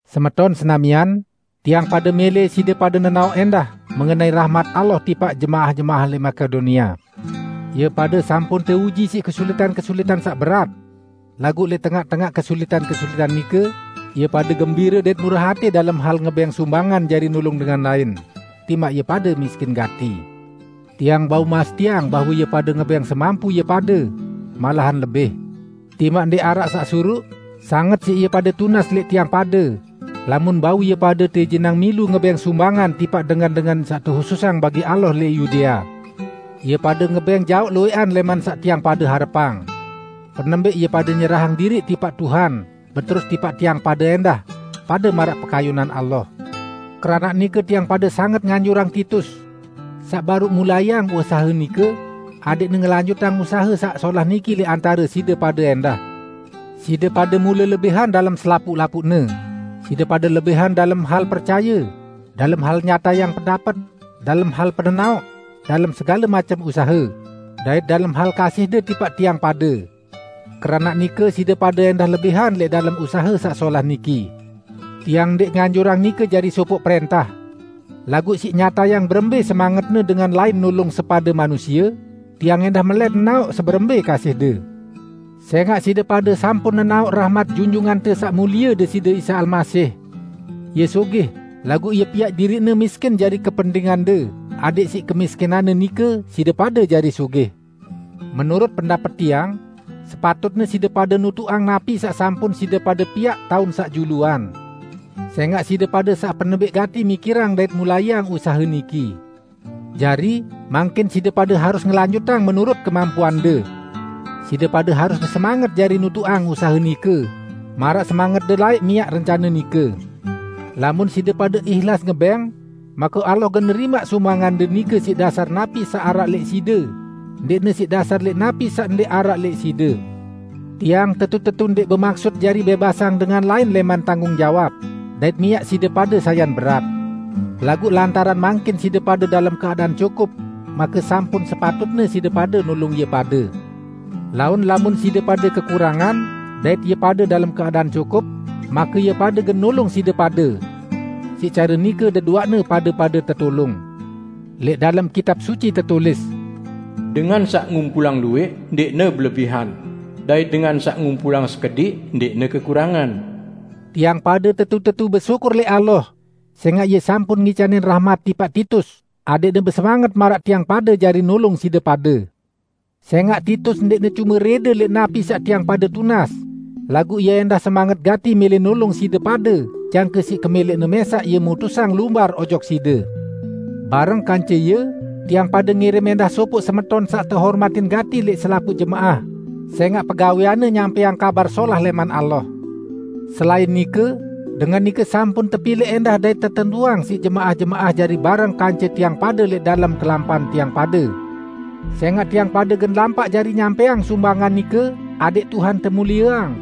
Semeton senamian, tiang pade mẽlẽ side pade nenaoq ẽndah mengenai rahmat Allah tipaq jemaah-jemaah lẽq Makedonia. Ie pade sampun teuji siq kesulitan-kesulitan saq berat. Laguq lẽq tengaq-tengaq kesulitan-kesulitan nike, ie pade gembire dait murah atẽ dalem hal ngebẽng sumbangan jari nulung dengan lain, timaq ie pade miskin gati. Tiang bau mastiang bahwe ie pade ngebẽng semampu ie pade, malahan lebih. Timaq ndẽq araq saq suruq, sanget siq ie pade tunas lẽq tiang pade lamun bau ie pade teijinang milu ngebẽng sumbangan tipaq dengan-dengan saq tehususang bagi Allah lẽq Yudea. Ie pade ngebẽng jaoq luwẽqan lẽman saq tiang pade harepang. Penembẽq ie pade nyerahang diriq tipaq Tuhan, beterus tipaq tiang pade ẽndah, pade maraq pekayunan Allah. Keranaq nike tiang pade sanget nganjurang Titus -- saq baruq mulaiang usahe nike, adẽqne ngelanjutang usahe saq solah niki lẽq antare side pade ẽndah. Side pade mule lebihan dalem selapuq-lapuqne: Side pade lebihan dalem hal percaye, dalem hal nyatayang pendapet, dalem hal penenaoq, dalem segale macem usahe, dait dalem hal kasihde tipaq tiang pade. Keranaq nike, side pade ẽndah lebihan lẽq dalem usahe saq solah niki. Tiang ndẽq nganjurang nike jari sopoq prẽntah. Laguq siq nyatayang berembẽ semangetne dengan lain nulung sepade manusie, tiang ẽndah melẽt nenaoq seberembẽ kasihde. Sẽngaq side pade sampun nenaoq rahmat Junjungante Saq Mulie Deside Isa Almasih. Ie sugih, laguq Ie piaq diriq-Ne miskin jari kepentingande, adẽq siq kemiskinan-Ne nike, side pade jari sugih. Menurut pendapet tiang, sepatutne side pade nutuqang napi saq sampun side pade piaq taun saq juluan. Sẽngaq side pade saq penembẽq gati mikirang dait mulaiang usahe niki. Jari, mangkin side pade harus ngelanjutang menurut kemampuande. Side pade harus besemanget jari nutuqang usahe nike, maraq semangetde laẽq miaq rencane nike. Lamun side pade ihlas ngebẽng, make Allah gen nerimaq sumbangande nike siq dasar napi saq araq lẽq side, ndẽqne siq dasar lẽq napi saq ndẽq araq lẽq side. Tiang tetu-tetu ndẽq bemaksut jari bẽbasang dengan lain lẽman tanggung jawab, dait miaq side pade sayan berat. Laguq, lantaran mangkin side pade dalem keadaan cukup, make sampun sepatutne side pade nulung ie pade. Laun lamun side pade kekurangan, dait ie pade dalem keadaan cukup, make ie pade gen nulung side pade. Siq care nike deduaqne pade-pade tetulung. Lẽq dalem Kitab Suci tetulis, "Dengan saq ngumpulang luwẽq, ndẽqne belebihan, dait dengan saq ngumpulang sekediq, ndẽqne kekurangan." Tiang pade tetu-tetu besyukur lẽq Allah sẽngaq Ie sampun ngicanin rahmat tipaq Titus adẽqne besemanget maraq tiang pade jari nulung side pade! Sẽngaq Titus ndẽqne cume rẽde lẽq napi saq tiang pade tunas, laguq ie ẽndah semanget gati mẽlẽ nulung side pade jangke siq kemẽlẽqne mẽsaq ie mutusang lumbar ojok side. Bareng kance ie, tiang pade ngirim ẽndah sopoq semeton saq tehormatin gati lẽq selapuq jemaah sẽngaq pegawẽanne nyampẽang Kabar Solah lẽman Allah. Selain nike, dengan nike sampun tepilẽq ẽndah dait tetentuang siq jemaah-jemaah jari bareng kance tiang pade lẽq dalem kelampan tiang pade. Sẽngaq tiang pade gen lampaq jari nyampẽang sumbangan nike, adẽq Tuhan temulieang,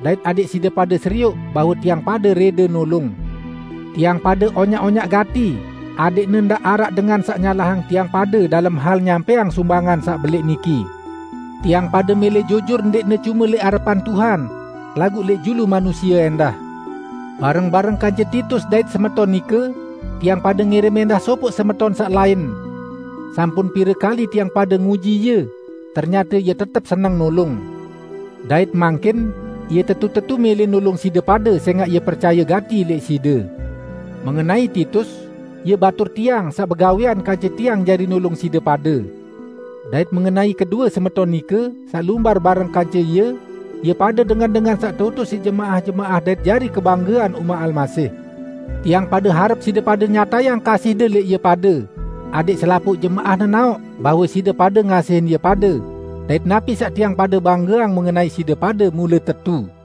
dait adẽq side pade serioq bahwe tiang pade rẽde nulung. Tiang pade onyaq-onyaq gati adẽqne ndaq araq dengan saq nyalahang tiang pade dalem hal nyampẽang sumbangan saq belẽq niki. Tiang pade mẽlẽ jujur ndẽqne cume lẽq arepan Tuhan, laguq lẽq julu manusie ẽndah. Bareng-bareng kance Titus dait semeton nike, tiang pade ngirim ẽndah sopoq semeton saq lain. Sampun pire kali tiang pade nguji ie, ternyate ie tetep seneng nulung. Dait mangkin, ie tetu-tetu mẽlẽ nulung side pade sẽngaq ie percaye gati lẽq side. Mengenai Titus, ie batur tiang, saq begawẽan kance tiang jari nulung side pade. Dait mengenai kedue semeton nike, saq lumbar bareng kance ie, ie pade dengan-dengan saq teutus siq jemaah-jemaah dait jari kebanggean umaq Almasih. Tiang pade harep side pade nyatayang kasihde lẽq ie pade, adẽq selapuq jemaah nenaoq bahwe side pade ngasihin ie pade dait napi saq tiang pade banggeang mengenai side pade mule tetu.